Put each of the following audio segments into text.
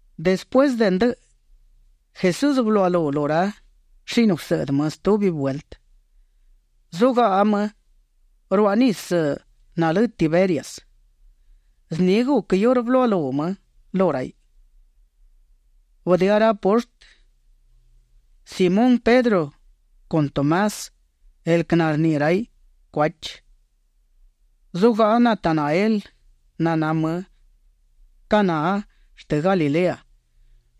Despuësë de ndëꞌë, Jesús bëluaꞌalú lu ra shini gusëꞌdë më stubi vueltë. Zugaꞌa më ruaꞌ nisë nalë Tiberias. Zni guc iurë bëluaꞌalú më lu raiꞌ. Bëdëá ra poshtë, Simón Pedro con Tomás, el quë narniꞌi raiꞌ Cuachi. Zugaꞌa Natanael naná më Caná shtë Galilea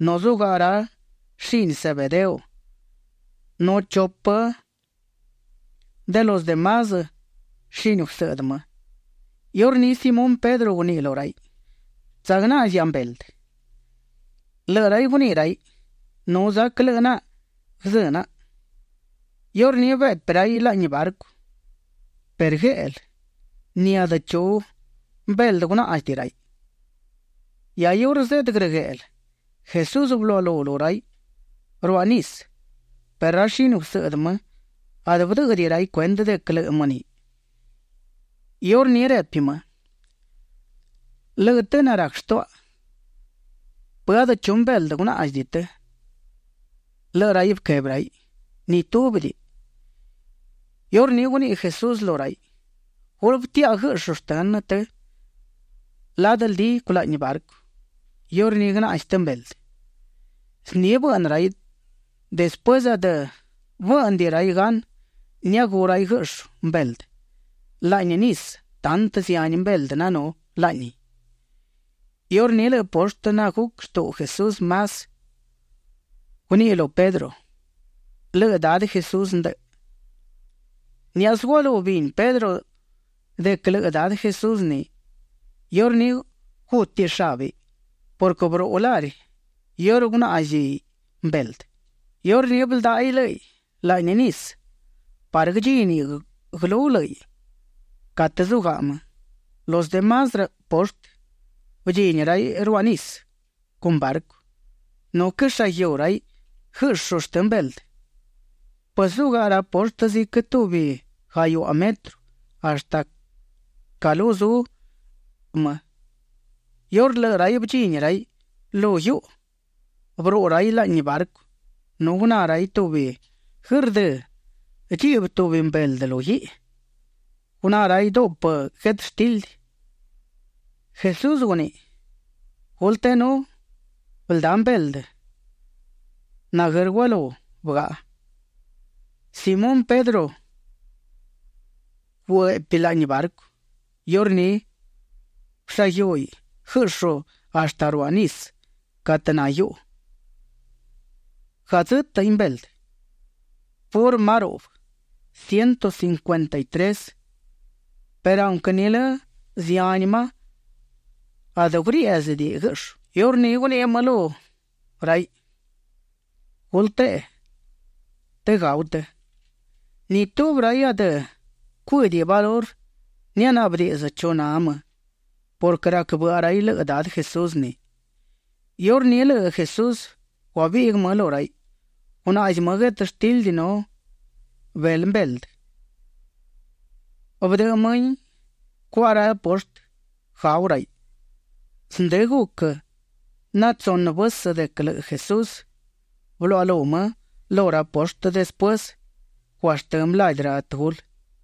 nu zugaꞌa ra shini Zebedeo nu chupë de los de más shini gusëꞌdë më. Iurní Simón Pedro guniꞌi lu raiꞌ: ―Tsagnaꞌzia mbeldë. Lëꞌë raiꞌ guniꞌi raiꞌ: ―Nu zac lëꞌë naꞌa guëzë́ naꞌa. Iurní beꞌpi raiꞌ laꞌni barcu, perë gueꞌlë ni adë chu mbeldë gunáꞌzidiꞌi raiꞌ. Hia iurë zeꞌdë grëgueꞌlë, Jesús bëluaꞌalú lu raiꞌ ruaꞌ nisë perë ra shini gusëꞌdë më adë bëdë́ꞌëdiꞌi raiꞌ cuendë de quë lëꞌë më ni. Iurní repi më: ―Lëꞌë të narac shtuaꞌa, ¿Pë adë chu mbeldë gunaꞌzi të? Lëꞌë raiꞌ bëquebi raiꞌ: ―Ni túbidiꞌi. Iurní guniꞌi Jesús lu raiꞌ: ―Gulë bëtiaꞌa guëꞌshu shtënë të ladë ldi culaꞌni barcu; iurní guënaꞌzi të mbeldë. Zni bëꞌnë raiꞌ. Despuësë adë bë́ꞌnëdiꞌi raiꞌ gan niagú raiꞌ guëꞌshu mbeldë laꞌni nisë tantë zihani mbeldë nanú laꞌni. Iurní lëꞌë poshtë naguc shtuꞌu Jesús más, guníꞌiꞌ lu Pedro: ―Lëꞌë Dadë Jesús ndë. Niáꞌasë gualú bini Pedro de quë lëꞌë Dadë Jesús ni, iurní gútiꞌ shabë purquë bëruꞌu lari iurë guagnáꞌziꞌ mbeldë. Iurní bëldáꞌaiꞌ lë́ꞌiꞌ laꞌni nisë parë guëdchíniꞌ guëlú lë́ꞌiꞌ catë zugaꞌa më. Los de más poshtë bëdchini raiꞌ ruaꞌ nisë con barcu. Nu quëshaguiú raiꞌ guëꞌshu shtë mbeldë. Pues zugaꞌa ra poshtë ziquë tubi gahiuꞌa metro hashtë ca lu zu më. Iurë lëꞌë raiꞌ bëdchini raiꞌ lu guiuꞌu, bëruꞌu raiꞌ laꞌni barcu nu guná raiꞌ tubi guërdë́ dchiꞌbë tubi mbeldë lu guiꞌi. Guná raiꞌ duꞌpë guetështildi. Jesús guniꞌi: ―Gulë teꞌenú bëldá mbeldë naguër gualú bëgaꞌa. Simón Pedro güeꞌpi laꞌni barcu; iurní bëshaguiúhiꞌ guëꞌshu hashtë ruaꞌ nisë catë na guiuꞌu. Gadzë́tëꞌin mbeldë, purë ma ruꞌbë, ciento cincuenta y tres; perë aunquë nilë zihani ma, adë guriéꞌzidiꞌi guëꞌshu. Iurní guniꞌi më lu raiꞌ: ―Gulë teꞌe të gau të. Ni tubi raiꞌ adë cuë́diꞌi valurë nianaꞌbë diꞌdzë chu na më purquë rac bëꞌa raiꞌ lëꞌë Dadë Jesús ni. Iurní lëꞌë Jesús guabiꞌguë më lu raiꞌ. Gunaꞌzi më guetështildi nu belë shtë mbeldë; bëdëꞌë mëhin cuaꞌa ra poshtë gau raiꞌ. Zndë guc natsunë vësë de quë lëꞌë Jesús bëluaꞌalú më lu ra poshtë despuësë guashtë́ më ladi ra tëgulë.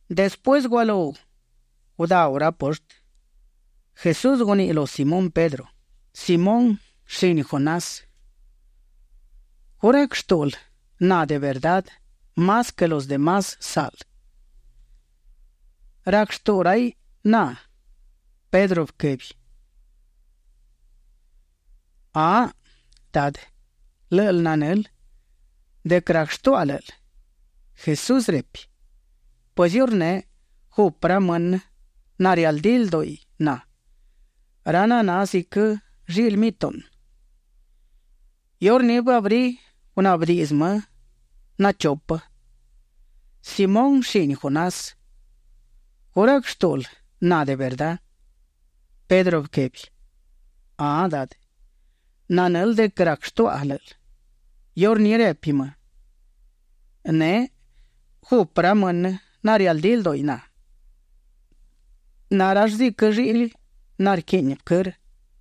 Despuësë gualú gudáu ra poshtë, Jesús guniꞌi lu Simón Pedro: ―Simón, shini Jonás, ¿gu rac shtúꞌul na de verdá más quë los de más saꞌl rac shtuꞌu raiꞌ na? Pedro bëquebi: ―Ahaꞌ Dadë, lë́ꞌël nanël de quë rac shtuaꞌa lë́ꞌël. Jesús repi: ―Pues iurneꞌ, gupë ra mënë narialdí lduꞌi na, ra naná ziquë lliꞌli mituꞌnë. Iurní bëabrí gunaꞌbë diꞌdzë më nachupë: ―Simón shini Jonás, ¿gu rac shtúꞌul na de verdá? Pedro bëquebi: ―Ahaꞌ Dadë, nanël de quë rac shtuaꞌa lë́ꞌël. Iurní repi më: ―Neꞌ gupë ra mënë narialdí lduꞌi na. Na rall ziquë lliꞌli narquiꞌni vëquërë.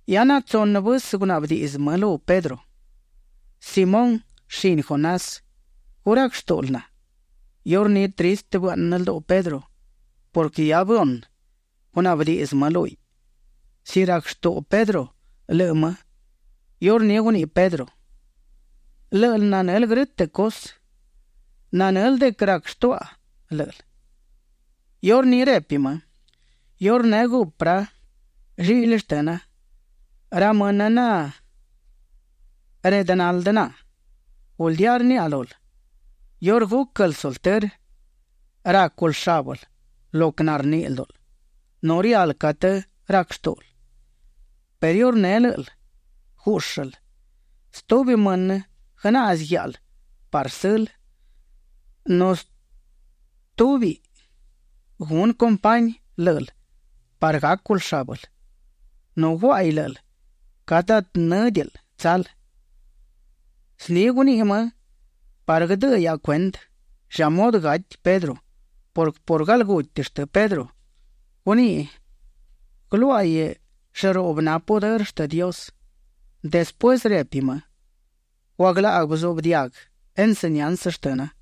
Hia natsunë vësë gunaꞌbë diꞌdzë më lu Pedro: ―Simón shini Jonás, ¿gu rac shtúꞌul na? Iurní tristë bëaꞌnë lduꞌu Pedro purquë hia bëhunë gunaꞌbë diꞌdzë më lúhiꞌ, si rac shtuꞌu Pedro lëꞌë më. Iurní guniꞌi Pedro: ―Lë́ꞌël nanël grë́tëꞌ cusë. Nanël de quë rac shtuaꞌa lë́ꞌël. Iurní repi më: ―Iurneꞌ gupë ra lliꞌli shtëna, ra mënë nareꞌdë naldë na. Guldía rniaꞌa lul, iurë gúquël sultërë, rácul shábël lo quë narniꞌi ldúꞌul nu rial catë rac shtúꞌul perë iurë lë́ꞌël gúꞌshël, stubi mënë guënaꞌzi guiáꞌal parë sël, nu stúbiꞌ gunë compañi lë́ꞌël parë gácul shábël, nu guáꞌaiꞌ lë́ꞌël catë adë në́diꞌil tsal. Zni guniꞌi më parë guëdëꞌë hiaꞌa cuendë lla mudë gati Pedro purquë por galguti shtë Pedro, gúniꞌ guëluáꞌaiꞌ llëruꞌbë na pudërë shtë Dios. Despuësë repi më: ―Guaglaꞌguë bëzuꞌbë diaguë enseñansë shtëna.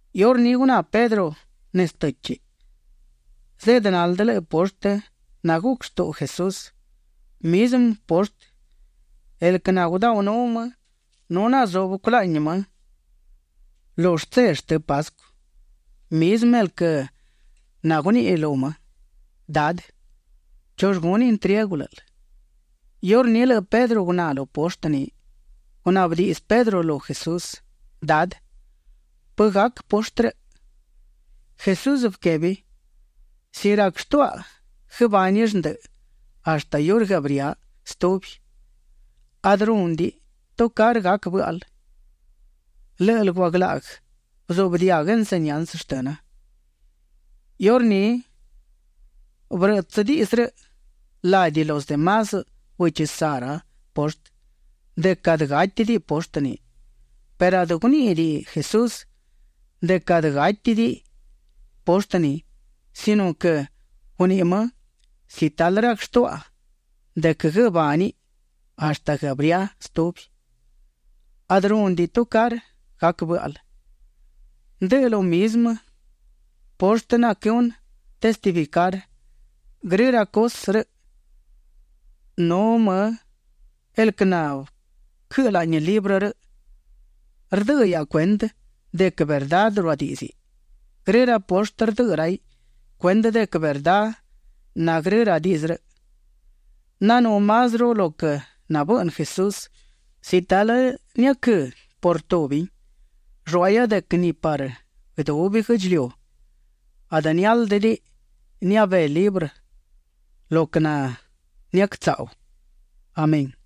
Iurní guná Pedro nezë të́chiꞌ; zeꞌdë naldë lëꞌë poshtë naguc shtuꞌu Jesús, mizmë poshtë el quë nagudaunú më nu nazubë culaꞌni më lu shtse shtë Pascu, mizmë el quë naguniꞌi lu më: “Dadë, ¿chull gunë intriegu lë́ꞌël?” Iurë lëꞌë Pedro guná lu poshtë ni, gunaꞌbë diꞌdzë Pedro lu Jesús: ―Dadë, ¿pë gac poshtë rëꞌ? Jesús bëquebi: ―Si rac shtuaꞌa guëbánill ndëꞌë hashtë iurë guëabría stubi, adë rúnëdiꞌi tucarë gac bë́ꞌal. Lë́ꞌël guaglaꞌguë bëzuꞌbë diaguë enseñansë shtëna. Iurní bërëꞌtsë diꞌdzë rëꞌ ladi los de más bëchi saꞌ ra poshtë de quë adë gátidiꞌi poshtë ni, perë adë guníꞌidiꞌi Jesús de quë adë gátidiꞌi poshtë ni, sino quë guniꞌi më: “Si talë na rac shtuaꞌa de quë guëbániꞌ hashtë guëabría stubi, adë rúnëdiꞌi tucarë gac bë́ꞌal”. Ndë lo mizmë poshtë naquëhunë testificar grë ra cusë rëꞌ, nu më el quë nabëquëꞌë laꞌni librë rëꞌ. Rdëꞌë hiaꞌa cuendë de quë verdá ruadíꞌdziꞌ. Grë ra poshtë rdëꞌë raiꞌ cuendë de quë verdá na grë ra diꞌdzë rëꞌ. Nanú másruꞌu lo quë nabëꞌnë Jesús. Si talë niaquëꞌë por tubin, lluáꞌahia de quë ni parë guëdubi guë́ꞌdchiliu adë niáldëdiꞌi nabé librë lo quë naniactsaꞌu. Amén.